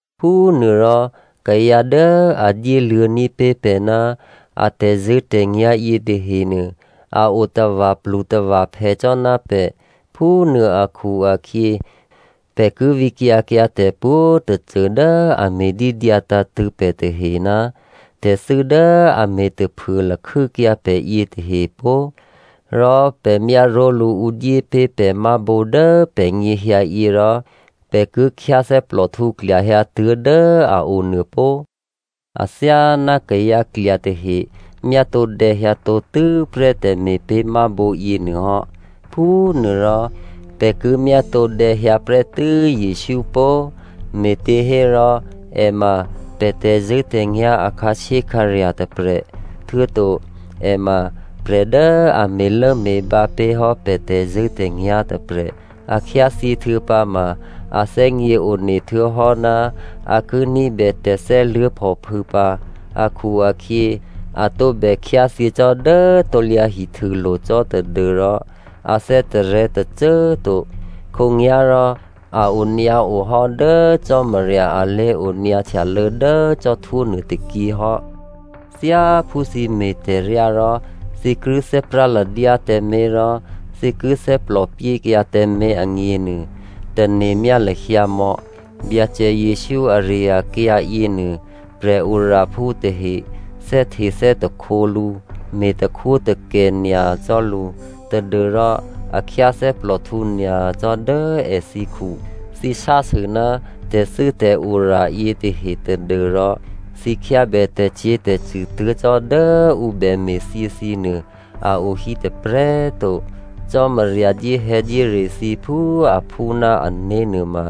Phúnuôrò, kayǎ dố a dyéluô̌ní̤ pé̤ pè̤ ná a tè̤zṳ̂́tè̤nyá̤ yětahenuô, a o tava̤plutava̤phè cò́ ná pè̤. Phúnuô akhu-akhyě, pè̤ ki vǐkyǎ kyǎ tè̤pwǒ̤꤮ tôcô dố a me̤ dídyǎ tǎ̤tṳ̂̌ pè̤ tahe ná tè̤thû́ dố a me̤ taphuô lakhû́kyǎ pè̤ yětahe pó꤮! Rò pè̤ myáró̤lǔ ǔ dyé pé̤ pè̤ mábǒ dố pè̤nyěhyǎ yě rò pè̤ ki khyáthè́plòhtǔ klyahyǎtuố̤ dố a o nuô pó꤮. Athyáná kayǎ klya tahe myátǒdè̌ hyǎtǒ tû́prè́ tè̤me̤pé̤mábǒ yěnuôhò́, phúnuôrò pè̤ ki myátǒdè̌ hyǎ prè́tû́ Jesǔ pó꤮. Me̤těhérò è ma pè̤ tè̤zṳ̂́tè̤nyá̤ a khǎshyékhǎrya̤ tôprè̤. Htuô̌to, è ma prè̤ dố a me̤lốme̤bǎ pé̤ hò́ pè̤ tè̤zṳ̂́tè̤nyá̤ tôprè̤. A khyáthyě htuô̌pǎma, a thè́gně one htuô̌hò́ ná a ki ní̤bè tè̤thè́luố̤phòphû̌ pǎ akhu-akhyě, a tǒbè khyáthyě cò́ dố krusulo̤ cò́ tadû́rò a thè́tarè̤̌ tôcô꤮ to. Khǒnyá̤rò a onyǎo hò́ dố Cò́marya a lé̤onyǎ htyalô̌ dố cò́htwó nuôtôkyě hò́. Thyáphú thǐ me̤ tè̤ryá rò thǐ ki thè́práladyá tǎmé̤, rò thǐ ki thè́plòpyékyǎ tǎmé̤ agněnuô, tane̤myá lahyǎmò̌ Byacè Jesǔ ari-akyǎ yěnuô, prè̤oraphú tahe thè́htethè́takhǒ lǔ me̤takhwótakè nyacò́ lǔ tadû́rò a khyáthè́plòhtǔ nyacò́ dố èthǐkhu. Thǐ sásû ná tè̤thû́tè̤ora yětahe tadû́rò thǐ khyábè tè̤cyě̤tè̤cṳ̂ tuố̤ cò́ dố ǔ bème̤thyě thǐnuô, a o hí tôprè̤꤮ to. Cò́marya dyéhè̌dyére thǐ phú aphú ná ané̤ nuôma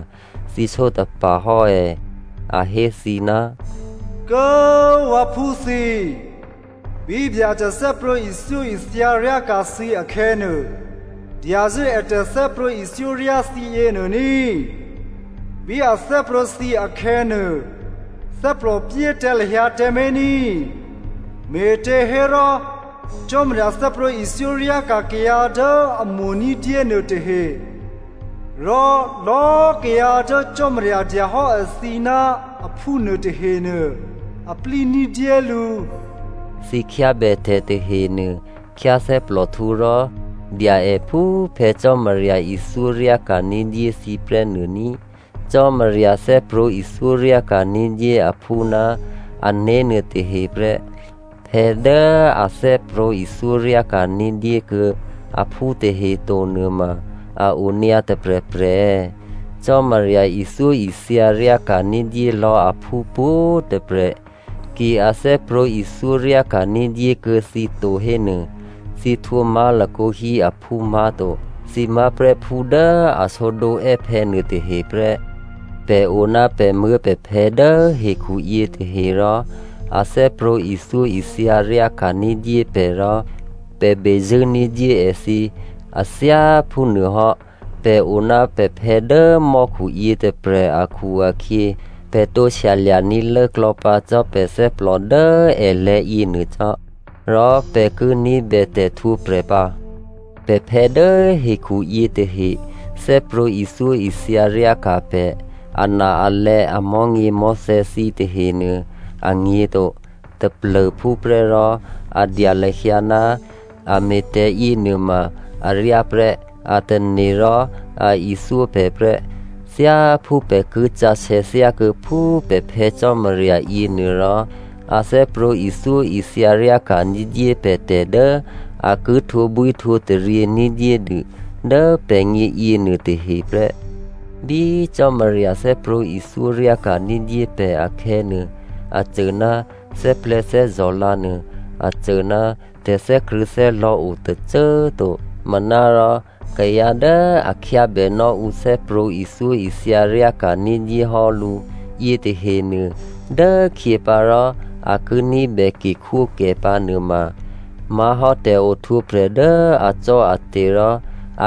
thǐ sǒtapa̤ hò́ è̌? A hé thǐ, “Kố꤮ vǎphú thǐ꤮ bí Byacè thè́prwǒ̤ ithyóithya ryáka̤ thǐ akhè̌nuô, dyazṳ̂́ è tè̤thè́prwǒ̤ ithyóryá thǐ yěnuô ní꤮. Bí a thè́prwǒ̤ thǐ akhè̌nuô, thè́plòpyé tǎ lahyǎ tǎmé̤ ní꤮. Me̤těhérò, Cò́marya thè́prwǒ̤ ithyóryáka̤ kayǎ dố a mo̤ ní̤dyé nuôtahe. Rò lò̌꤮ kayǎ dố Cò́marya dya hò́ èthǐ ná aphú nuôtahenuô, a plí ní̤dyé lǔ.” Thǐ khyábè tè̤tahenuô, khyáthè́plòhtǔ rò dya è phú Phè̌ Cò́marya ithyóryáka̤ ní̤dyé thǐ prè́ nuô ní꤮. Cò́marya thè́prwǒ̤ ithyóryáka̤ ní̤dyé aphú ná ané̤ nuôtahe prè́. Phè̌ dố a thè́prwǒ̤ ithyó ryáka̤ní̤ dyékuô̌ aphú tahe to nuôma a o nyǎ tôprè̤prè̤ è̌? Cò́marya ithyóithya ryáka̤ ní̤dyé lò̌ aphú pwǒ̤꤮ tôprè̤. Ki a thè́prwǒ̤ ithyóryáka̤ ní̤dyé kuô̌ thǐ to hénuô, thǐ htwǒ má̤lakǒ hí aphú má̤to. Thǐ má̤prè́ phú dố a sǒdǒ è́phè̌ nuôtahe prè́. Pè̤ o ná pè̤muố̤pè̤phè̌ dố hekhuyě tahe rò a thè́prwǒ̤ ithyóithya ryáka̤ ní̤dyé pè̤ rò pè̤ bezṳ̂́ ní̤dyé èthǐ. A thyá phúnuôhò́ pè̤ o ná pè̤phè̌ dố mò́khu yětôprè̤ akhu-akhyě, pè̤ tǒ shyalya̤ní̤ lốklò̌pǎ cò́ pè̤ thè́plò dố èlè̤̌ yěnuô cò́. Rò pè̤ ki ní̤bè tè̤htwǒprè̤ pǎ. Pè̤phè̌ dố hekhu yětahe thè́prwǒ̤ ithyóithya ryáka̤ pè̤ ana-alè̌ amò̤́nyěmò̤́thè̌ thǐ tahenuô, a nyě̤to, taplô̤phúprè́ rò a dya lahyǎ ná a me̤ tè̤ yěnuôma aryá prè́ a tane̤ rò a ithyó pè̤ prè́. Thyáphú pè̤ ki sǎsè̌ thyákuô̌ phú pè̤ Phè̌ Cò́marya yěnuôrò, a thè́prwǒ̤ ithyóithya ryáka̤ ní̤dyé pè̤ tè̤ dố a ki htwǒbwíhtwǒtaryě ní̤dyédû dố pè̤gně yěnuôtahe prè́. Bí Cò́marya thè́prwǒ̤ ithyó ryáka̤ ní̤dyé pè̤ akhè̌nuô, a cô ná thè́plè̤̌thè́zò̤ lǎ nuô, a cô ná tè̤thè́krṳ̂̌thè́lò̌ o tôcô꤮ to. Manárò kayǎ dố a khyábènò́ ǔ thè́prwǒ̤ ithyóithya ryáka̤ ní̤dyé hò́ lǔ yětahenuô dốkhyěpǎ rò a ki ní̤bè ke khwókè pǎnuôma má̤hò́ tè̤ohtwǒprè̤ dố acò́ate̤ rò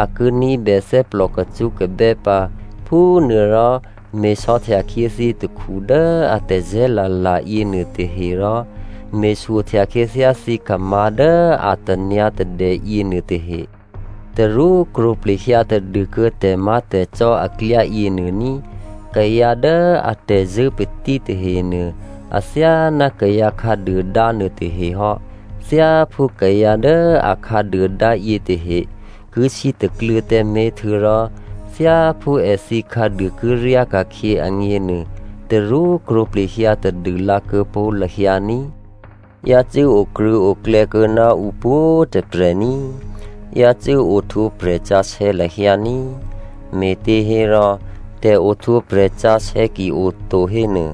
a ki ní̤bè thè́plò kacṳ́kabè́ pǎ. Phúnuôrò, me̤sò̌htya khyě thǐ takhu dố a tazè̤́ la̤la̤ yěnuô tahe, rò me̤shyohtya khyěthyá thǐkhamǎ̤ dố a tanyǎ̤tadè yěnuôtahe. Tarú krwǒplehyǎ tadûkuô̌ tè̤má̤tè̤cò́ aklyá yěnuô ní꤮. Kayǎ dố atè̤zṳ̂́ patí tahenuô athyáná kayǎ khǎduôdá nuôtahe hò́. Thyáphú kayǎ dố a khǎduôdá yětahe ki sítakluô̌ tǎmé̤, htuô̌rò thyáphú èthǐ khǎduô ki ryáka̤khyě agněnuô, tarú krwǒ plehyǎ tadûlǎ kuô̌pó̤ lahyǎ ní꤮. Yácû́ okrṳ̂̌oklè̌ kuô̌ ná ǔ pwǒ̤꤮ tôprè̤ ní꤮. Yácû́ ohtwǒprè̤ sǎsè̌ lahyǎ ní꤮. Me̤těhérò tè̤ohtwǒprè̤ sǎsè̌ ki oto hénuô,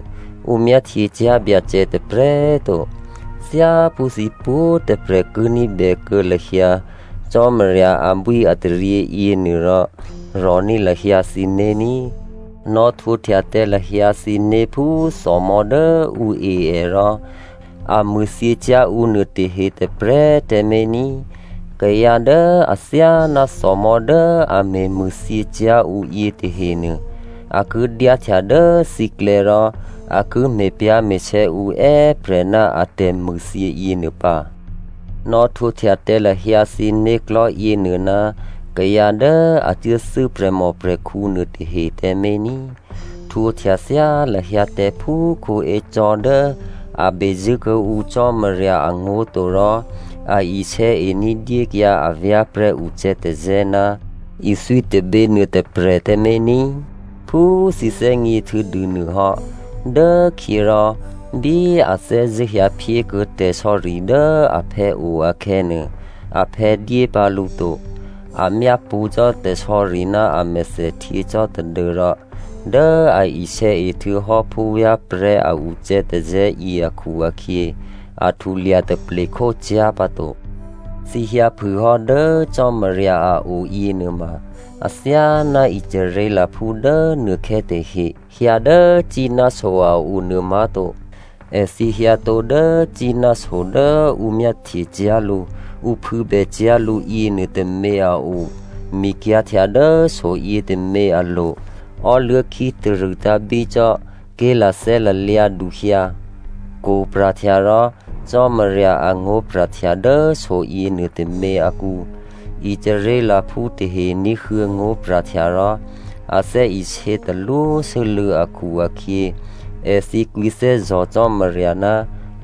ǔ myáhtyecyá̤ Byacè tôprè̤꤮ to. Thyáphú thǐ pwǒ̤꤮ tôprè̤ ki ní̤bè kuô̌ lahyǎ Cò́marya abwíataryě yěnuôrò, rò̤ní̤ lahyǎ thǐné̤ ní꤮. Nò̌htwǒhtya tǎ lahyǎ thǐné̤ phú thòmò̤́ dố ǔ e è rò a mṳ̂thyěcyá̤ ǔ nuôtahe tôprè̤꤮ tǎmé̤ ní꤮. Kayǎ dố athyáná thòmò̤́ dố a me̤ mṳ̂thyěcyá̤ ǔ yětahenuô a ki dyáhtya dố thǐklè̌ rò a ki me̤pyá̤me̤sè̌ ǔ è́prè̤ ná a tè̤mṳ̂thyě yěnuô pǎ. Nò̌htwǒhtya tǎ lahyǎ thǐ né̤klò̤́ yěnuô ná kayǎ dố a cuốthû́ prè̤mòprè̤khǔ nuôtahe tǎmé̤ ní꤮. Htwǒhtya thyá lahyǎ tǎ phú Esau dố a be zṳ̂́ kuô̌ǔ Cò́marya angó̤ to rò a isè̌e ní̤dyékyǎ avyá̤prè̤́ ucè̌tazè̌ ná ithwí tôbě nuôtôprè̤꤮ tǎmé̤ ní꤮. Phú thǐ thè́gně htuô̌dû nuôhò́, dốkhyě rò bí a thè́zṳ̂́ hyǎ phyékuô̌ tè̤sò̌ri dố aphè̌ o akhè̌nuô, aphè̌ dyé pǎ lǔ to. A myápṳ̌ cò́ tè̤sò̌ri ná amèthèhtyě cò́ tadû́rò, dố a isè̌e htuô̌hò́ phúvyá̤prè̤́ a ucè̌tazè̌ yě akhu-akhyě, a htulya taple khócyá̤ pǎto. Thǐ hyǎphû hò́ dố Cò́marya a o yěnuôma, athyáná Israelphú dố nuôkhè̌ tahe hyǎ dố Sínai so a o nuô má̤to. Èthǐ hyǎtǒ dố Sínai so dố ǔ myáhtyecyá̤ lǔ, ǔ phû̌bè cyá̤ lǔ yěnuôtômě a o, mikyǎ̤htya dố soyětômě alo̤, ò́luố̤ khítarṳ̂ tǎ̤bícò́, ké̤lathè́ lalyǎduhyǎ, kwo̤ pra̤htya rò Cò́marya angó̤pra̤htya dố soyě nuôtômě akǔ. Israelphú tahe ní̤huô̌ ngó̤pra̤htya rò a thè́isě talwósû́lû̌ akhu-akhyě, èthǐ kwǐthè́zò̤ Cò́marya ná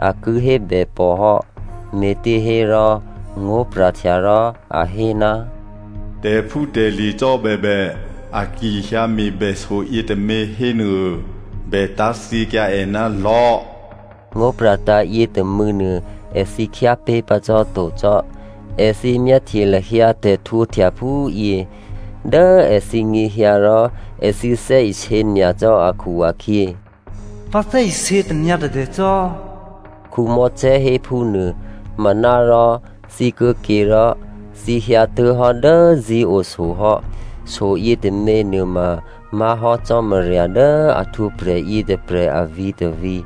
a ki hébè pòhò́. Me̤těhérò, ngó̤pra̤htya rò a hé, “Tè̤phútè̤lye̤ cò́ bèbè a ki hyǎ me̤bè soyětômě hénuô, bè tá̤thyěkyǎ è ná lò̤́,” ngó̤ pra̤tǎ̤ yětômû̌nuô èthǐ khyápé̤ pǎ cò́to cò́. Èthǐ myáhtye lahyǎ tè̤ htwǒhtya phúyě dố èthǐ nyěhyǎ rò, èthǐ thè́isě nyacò́ akhu-akhyě, “Vǎ thè́isě tanyǎ̤tadè cò́” Mosè hé phúnuô. Manárò, thǐ kuô̌ke rò thǐ hyǎtuố̤hò́ dố Zion so hò́. So yětôměnuô ma má̤hò́ Cò́marya dố a htwǒprè̤ yětôprè̤ avǐ̤ tôvǐ̤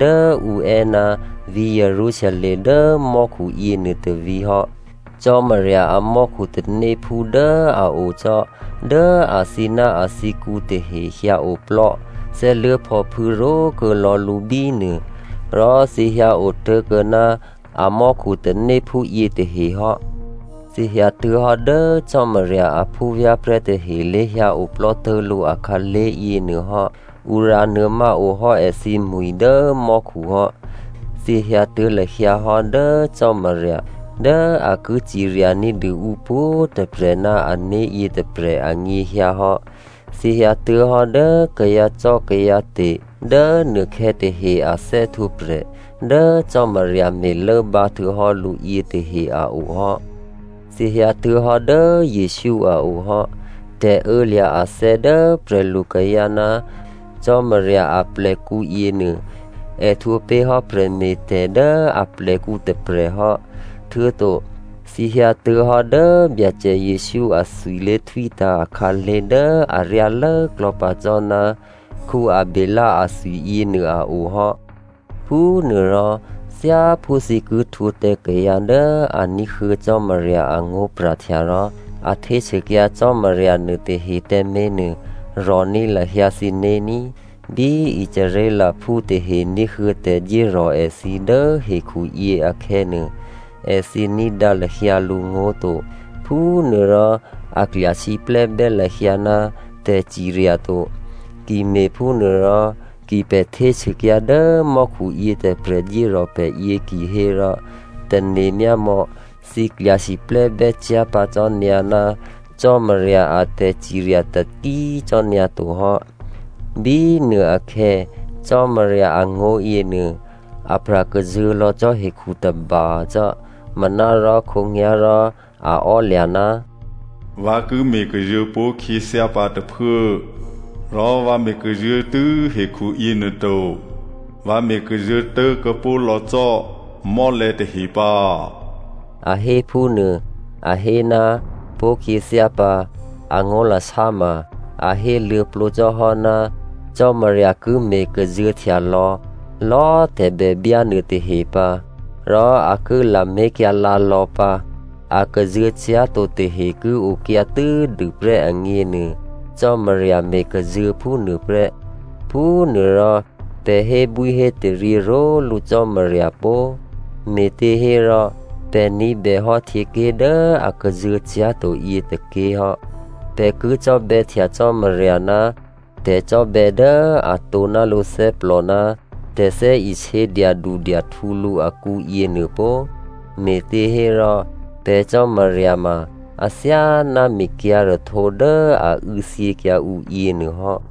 dố ǔ è́ ná vǐ̤ Jerusalem dố mò́khu yěnuô tôvǐ̤ hò́. Cò́marya amò́khu tanéphú dố a o cò́ dố athǐ ná athǐkǔ tahe hyǎoplò́ thè́luố̤phòphû̌ ró̤kuô̌ lò̌ lǔ bínuô. Rò thǐ hyǎ otố̤kuô̌ ná amò́khu tanéphú yětahe hò́. Thǐ hyǎtuố̤hò́ dố Cò́marya a phúvyá̤prè̤́ tahe lé̤hyǎ oplò́ tố̤lǔ akhǎlé̤ yěnuôhò́. Ǔ rǎnuô̌má ohò́ èthǐmwi̤ dố mò́khu hò́. Thǐ hyǎtuố̤ lahyǎ hò́ dố Cò́marya dố a ki cirya ní̤dû ǔ pwǒ̤꤮ tôprè̤ ná ané̤ yětôprè̤ anyěhyǎ hò́. Thǐ hyǎtuố̤hò́ dố kayǎcò́kayǎte̤ dố nuôkhè̌ tahe a thè́htwǒprè̤ dố Cò́marya me̤lốbǎ htuô̌hò́ lǔ yětahe a o hò́. Thǐ hyǎtuố̤hò́ dố Jesǔ a o hò́. Tè̤ô̌lya̤ athè̌ dố prè̤lukayǎ ná Cò́marya aplèkǔ yěnuô è htwǒ pé̤ hò́ prè̤me̤tè̤ dố aplèkǔ tôprè̤ hò́. Htuô̌to thǐ hyǎtuố̤hò́ dố Byacè Jesǔ athwi lé̤htwítǎ̤ akhǎlé̤ dố aryá lốklò̌ pǎ cò́ ná Abělè athwiyě nuô a o hò́. Phúnuôrò, thyáphú thǐ ki htwǒ tǎ kayǎ dố a ní̤huô̌ Cò́marya angó̤pra̤htya rò a htésûkyǎ Cò́marya nuôtahe tǎmé̤nuô, rò̤ní̤ lahyǎ thǐné̤ ní꤮. Bí Israelphú tahe ní̤huô̌ tè̤dyérò̤ èthǐ dố hekhuyě akhè̌nuô, èthǐ ní̤dǎ lahyǎ lǔngó̤ to. Phúnuôrò a klya siplè́bè́ lahyǎ ná tè̤cirya to. Ki me̤phúnuôrò ki pè̤ htésûkyǎ dố mò́khu yětôprè̤ dyérò̤ pè̤yě kihérò, tane̤myámò̌, thǐ klya siplè́ bè́cyá̤ pǎ cò́nyǎ ná Cò́marya a tè̤cirya taki꤮ cò́ nyǎtohò́. Bínuôakhè̌ Cò́marya angó̤ yěnuô apra̤ kazuô̤̌ lò̌ cò́ hekhu tôba cò́. Manárò khǒnyá̤rò a ò́lya̤, “Vǎ ki me̤ kazuô̤̌ pó̤ khyěthyá pǎ tôphuố, rò vǎ me̤ kazuô̤̌ tû́ hekhu yěnuô to, vǎ me̤ kazuô̤̌tố̤ kuô̌pó̤ lò̌ cò́ mò́lè̤̌ tahe pǎ,” a hé phúnuô. A hé, “Pó̤khyěthyá pǎ,” angó̤lasá ma, a héluô̌plǒ cò́hò́ ná Cò́marya ki me̤ kazuô̤̌htya lò̌lò̌꤮ tè̤bèbyá nuôtahe pǎ, rò a ki lamé̤kyǎlǎ lò̌ pǎ. A kazuô̤̌ cyá̤to tahe ki okyǎ tû́dûprè́ agněnuô, Cò́marya me̤kazuô̤̌ phúnuôprè́. Phúnuôrò, pè̤ hébwíhétaryě ró̤lǔ Cò́marya pó꤮, me̤těhérò pè̤ ní̤bèhò́ htyěké̤ dố a kazuô̤̌ cyá̤to yětôké̤hò́. Pè̤ ki cò́bè̌htya Cò́marya ná tè̤cò́bè̌ dố atǒ ná lǔthè́plò ná tè̤thè́isě dyadudyahtǔ lǔ akǔ yěnuô pó꤮. Me̤těhérò pè̤ Cò́marya ma athyáná mikyǎ̤rahtǒ dố a û̌thyěkyǎ ǔ yěnuôhò́.